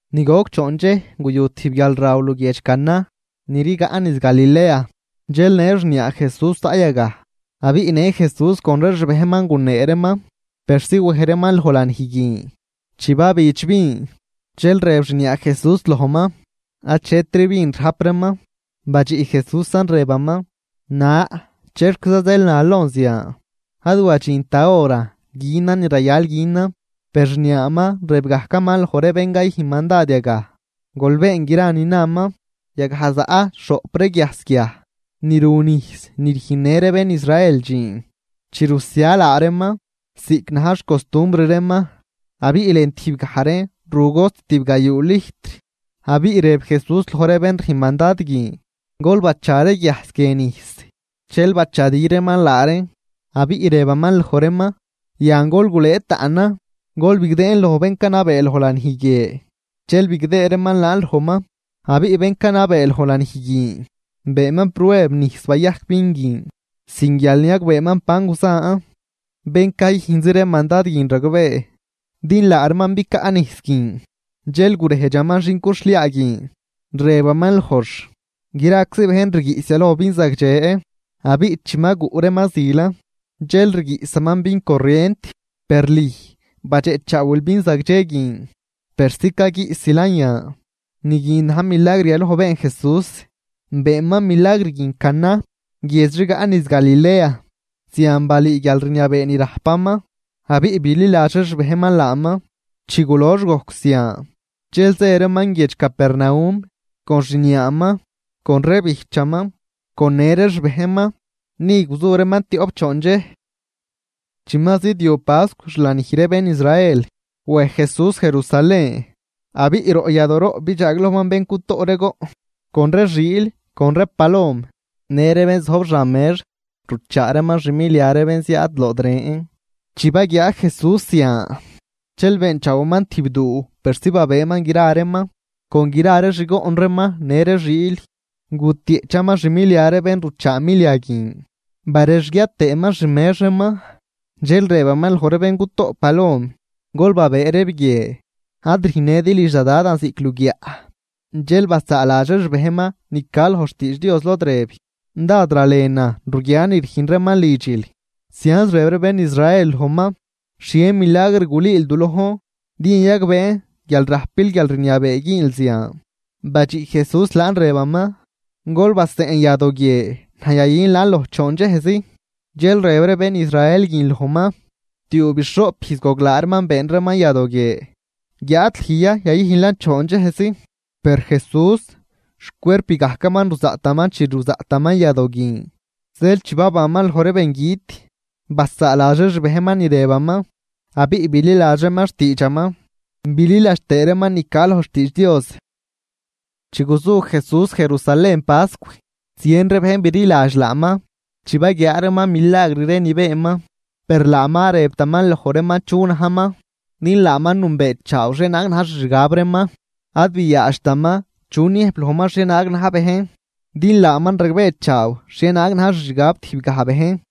Ni goc choon dxej guyu tijb guialruxhliaa luguiedx Caná, ni rigaꞌ niz Galilea. Dxel në xniaa Jesús zaꞌ yagaj, abiꞌ në Jesús con ree xbejnman gunee reeman persi wej reeman loj lanij guin. Chi babidx vin, dxel rëb xniaa Jesús lojman: ―Achetri vin rajp reeman. Badxiꞌ Jesúsan rëbaman: ―Na, ¿chexquiza zeel nal lon zian? Ad wadxint da horan günan ni rayal günan. Per xniaaman rëb gajcaman loj ree bén cayüjn mandad yagaj: ―Gol been gra ni naman. Yagaj zaꞌ xhoꞌp ree guiajs guiaj, ni ru nijs ni rüjnnë ree bén Israel dxiin chi rusia laa reeman ziꞌc na̱j xcostumbr reeman. Abiꞌ lën tijbgaj reen ru cost tibgayuu lijtr. Abiꞌ rëb Jesús loj ree bén rüjn mandad guin: ―Gol bacha ree guiajs guie nijs. Dxel bachadi reeman laa reen, abiꞌ rëbaman loj reeman: ―Yan gol gulëë taꞌnan, gol bigdëën loj bén canabee loj lanij guie. Dxel bigdëë reeman laan lojman, abiꞌ bén canabee loj lanij guin beenman prueb nijs bayajc vin guin, sin guial niagbeeman ban guzan, bén cayüjnz ree mandad guin ragbee, din laa reeman bicaꞌ nijs guin. Dxel gurejdxaman xin cuxhliaa guin, rëbaman lojx: ―Graczi bejn rguiꞌs yaloj vin zagdxe, abiꞌ chi ma guꞌ reeman zilan, dxel rguiꞌsaman vin corrient. Per lüj badxeꞌchaawil vin zagdxe guin persi caguiꞌsilan yan. Ni guin na̱j milagr yaloj been Jesús, beenman milagr guin Caná, guiedx rigaꞌ niz Galilea. Zian balüü guialrniabee ni rajpaman abiꞌ bililadx ree xbejnman laaman. Chi gulox gojc zian dxel zë reeman guiedx Capernaum, con xniaaman, con ree bijchaman con në ree xbejnman. Ni guzu reeman tioꞌp choon dxej. Chi ma zidyob pascw xlanij ree bén Israel, wej Jesús Jerusalén. Abiꞌ roꞌ yadooroꞌ bidxaaglojman bén cutoꞌ ree goꞌn, con ree xiil con ree palom, në ree bén zojb xan mex ruchaa reeman xmilia ree bén ziaad lood ren. Chi baguiaa Jesús zian, dxel beenchaawaman tijb duu persi babëëman gra reeman, con gra ree xgoꞌn reeman në ree xiil. Gutieꞌchaman xmilia ree bén ruchaa milia guin barexguiat tëëman xmex reeman. Dxel rëbaman loj ree bén cutoꞌ palom: ―¡Gol babëë reeb guie! ¡Ad rüjnnëdi lidx da Dadan ziꞌc luguiaꞌ! Dxel basaaladx ree xbejnman ni ca loj xtiidx Dios lod rëb: “Dád ralenan ruguian ni rüjn reeman lidxil.” Zianz rëb ree bén Israel lojman: ―¿Xhie milagr gulüül du lojn din yayagbeen guial rajpil guialrniabee güünl zian? Badxiꞌ Jesús laan rëbaman: ―Gol baseꞌn yadoo guie, naj yayün laan loj choon dxejzi. Dxel rëb ree bén Israel guin lojman: ―Tiuubixhoꞌp ijz goglaa reeman been reeman yadoo guie, ¿guiáad lüj ya yayüjnlan choon dxejzi? Per Jesús xcuerp gajcaman ruzaꞌtaman chi ruzaꞌtaman yadoo guin. Zeel chi babanman loj ree bengüt, basaaladx ree xbejnman ni rëbaman, abiꞌ bililadx reeman xtiidxaman bililadx tëë reeman ni ca loj xtiidx Dios. Chi guzu Jesús Jerusalén pascw, zien ree bejn bililadx laaman, chi baguiaa reeman milagr ree ni beenman. Per laaman ad rëbtaman loj reeman chu najman, din laaman nünbeechaaw xhienaag na̱j xixgab reeman. Ad biaadxtaman chu niëjb lojman xhienaag na̱j bejn, din laaman ragbeechaaw xhienaag na̱j xixgab tijbgaj bejn.